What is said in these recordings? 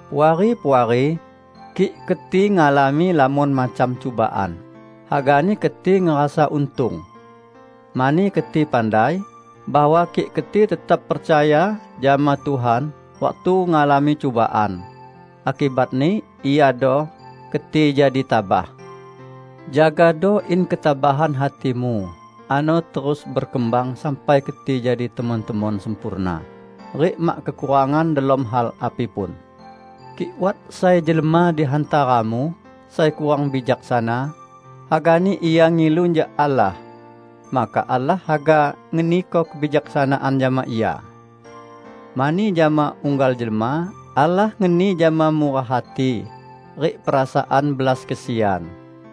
Puari-puari! Kik keti ngalami lamon macam cubaan, hagani keti ngerasa untung. Mani keti pandai, bahwa kik keti tetap percaya jama Tuhan waktu ngalami cubaan, akibatni iado: keti jadi tabah. Jagado in ketabahan hatimu ano terus bekembang sampai keti jadi temon-temon sempurna rik mak kekurangan delom hal api pun. Kik wat sai jelma di hantaramu sai kurang bijaksana, hagani ia ngilu jak Allah, maka Allah haga ngeniko kebijaksanaan jama ia; mani jama unggal jelma, Allah ngeni jama murah hati rik perasaan belas kesian.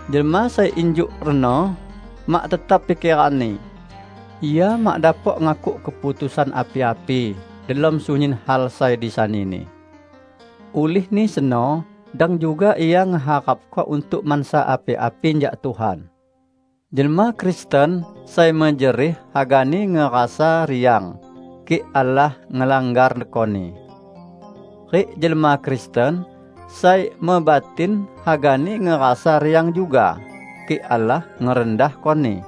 Jelma sai injuk reno mak tetap pikeranni; ia mak dapok ngakuk keputusan api-api delom sunyin hal sai disanini. Ulihni seno, dang juga ia ngeharapko untuk mansa api-api jak Tuhan. Jelma Kristen sai mejerih hagani ngerasa riang kik Allah ngelanggarkoni. Rik jelma Kristen sai mebatin hagani ngerasa riang juga, kik Allah ngerendahkoni.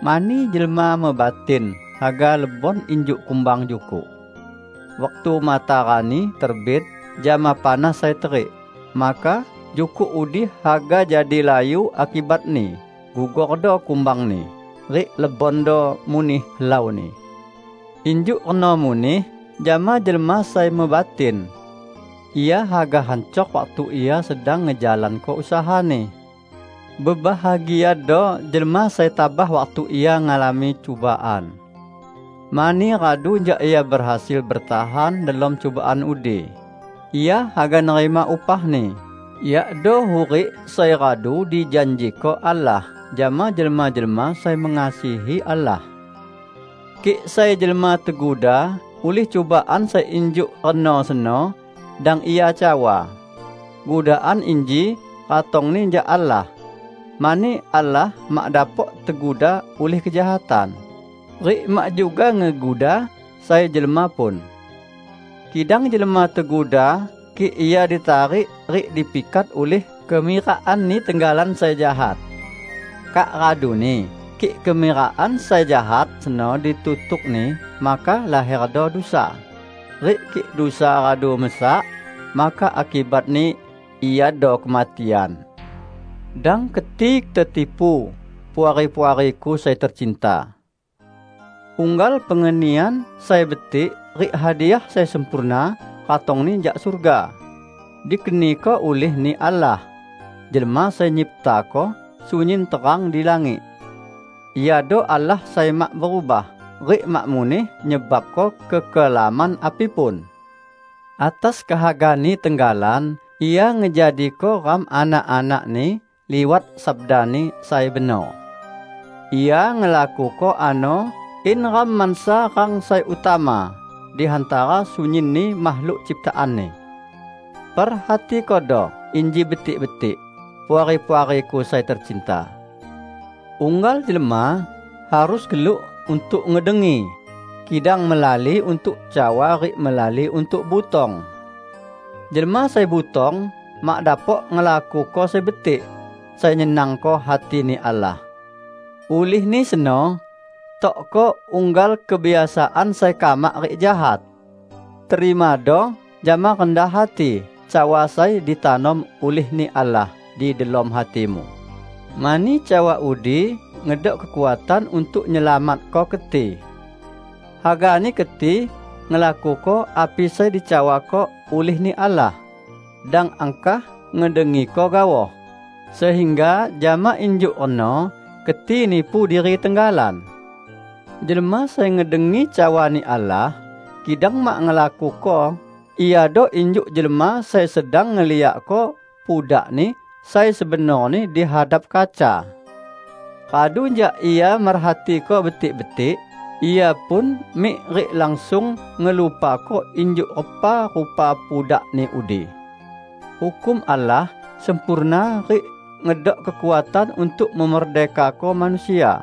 Mani jelma mebatin haga lebon injuk kumbang jukuk. Waktu matarani terbit jama panas sai terik, maka jukuk udi haga jadi layu akibatni gugordo kumbangni rik lebondo muneh helauni. Injuk reno muneh jama jelma sai mebatin; ia haga hancor waktu ia sedang ngejalanko usahani. Bebahagiado jelma sai tabah waktu ia ngalami cubaan. Mani radu jak ia behasil betahan delom cubaan udi, ia haga nerima upahni, yakdo hurik sai radu dijanjiko Allah jama jelma-jelma sai mengasihi Allah. Kik sai jelma teguda ulih cubaan sai injuk reno seno, dang ia cawa, "Gudaan inji ratongni jak Allah," mani Allah mak dapok teguda ulih kejahatan, rik mak juga ngeguda sai jelma pun. Kidang jelma teguda kik ia ditarik rik dipikat ulih kemirakanni tenggalan sai jahat. Kak raduni, kik kemirakan sai jahat seno ditutukni, maka laherdo dusa; rik kik dusa radu mesak, maka akibatni iado kematian. Dang keti tetipu, Puari-puariku sai tecinta! Unggal pengenian sai betik rik hadiah sai sempurna ratongni jak surga, dikeniko ulih-Ni Allah, Jelma Sai Nyiptako sunyin terang di langit. Iado Allah sai mak berubah, rik mak muneh nyebabko kekelaman api pun. Atas kehaga-Ni tenggalan Ia ngejadiko ram anak-anak-Ni liwat sabda-Ni sai benor. Ia ngelakuko ano in ram mansa rang sai utama di hantara sunyinni makhluk ciptaan-Ni. Perhatikodo inji betik-betik, Puari-puariku sai tecinta! Unggal jelma harus geluk untuk ngedengi, kidang melali untuk cawa rik melali untuk butong. Jelma sai butong mak dapok ngelakuko sai betik, sai nyenangko hati-Ni Allah. Ulihni seno, tokko unggal kebiasaan sai kamak rik jahat. Terimado jama rendah hati cawa sai ditanom ulih-Ni Allah di delom hatimu, mani cawa udi ngedok kekuatan untuk nyelamatko keti. Hagani keti ngelakuko api sai dicawako ulih-Ni Allah, dang angkah ngedengiko gaoh, sehingga jama injuk reno keti nipu diri tenggalan. Jelma sai ngedengi cawa-Ni Allah, kidang mak ngelakuko iado injuk jelma sai sedang ngeliakko pudakni sai sebenorni di hadap kaca. Radu jak ia merhatiko betik-betik ia pun mik rik langsung ngelupako injuk repa rupa pudakni udi. Hukum Allah sempurna rik ngedok kekuatan untuk memerdekako manusia.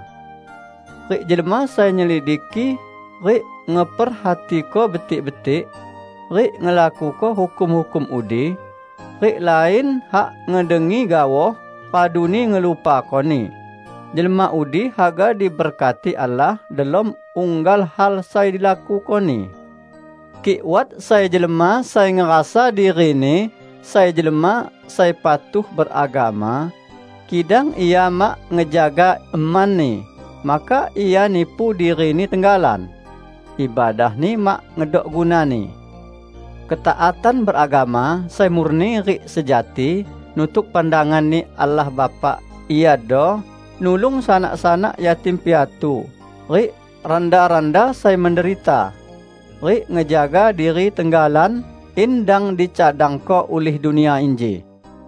Rik jelma sai nyelidiki rik ngeperhatiko betik-betik, rik ngelakuko hukum-hukum udi, rik lain hak ngedengi gaoh raduni ngelupakoni, jelma udi haga diberkati Allah delom unggal hal sai dilakukoni. Kik wat sai jelma sai ngerasa dirini sai jelma sai patuh beragama, kidang ia mak ngejaga emani, maka ia nipu dirini tenggalan; ibadahni mak ngedok gunani. Ketaatan beragama sai murni rik sejati nutuk pandangan-Ni Allah Bapa iado: nulung sanak-sanak yatim piatu rik randa-randa sai menderita, rik ngejaga diri tenggalan in dang dicadangko ulih dunia inji.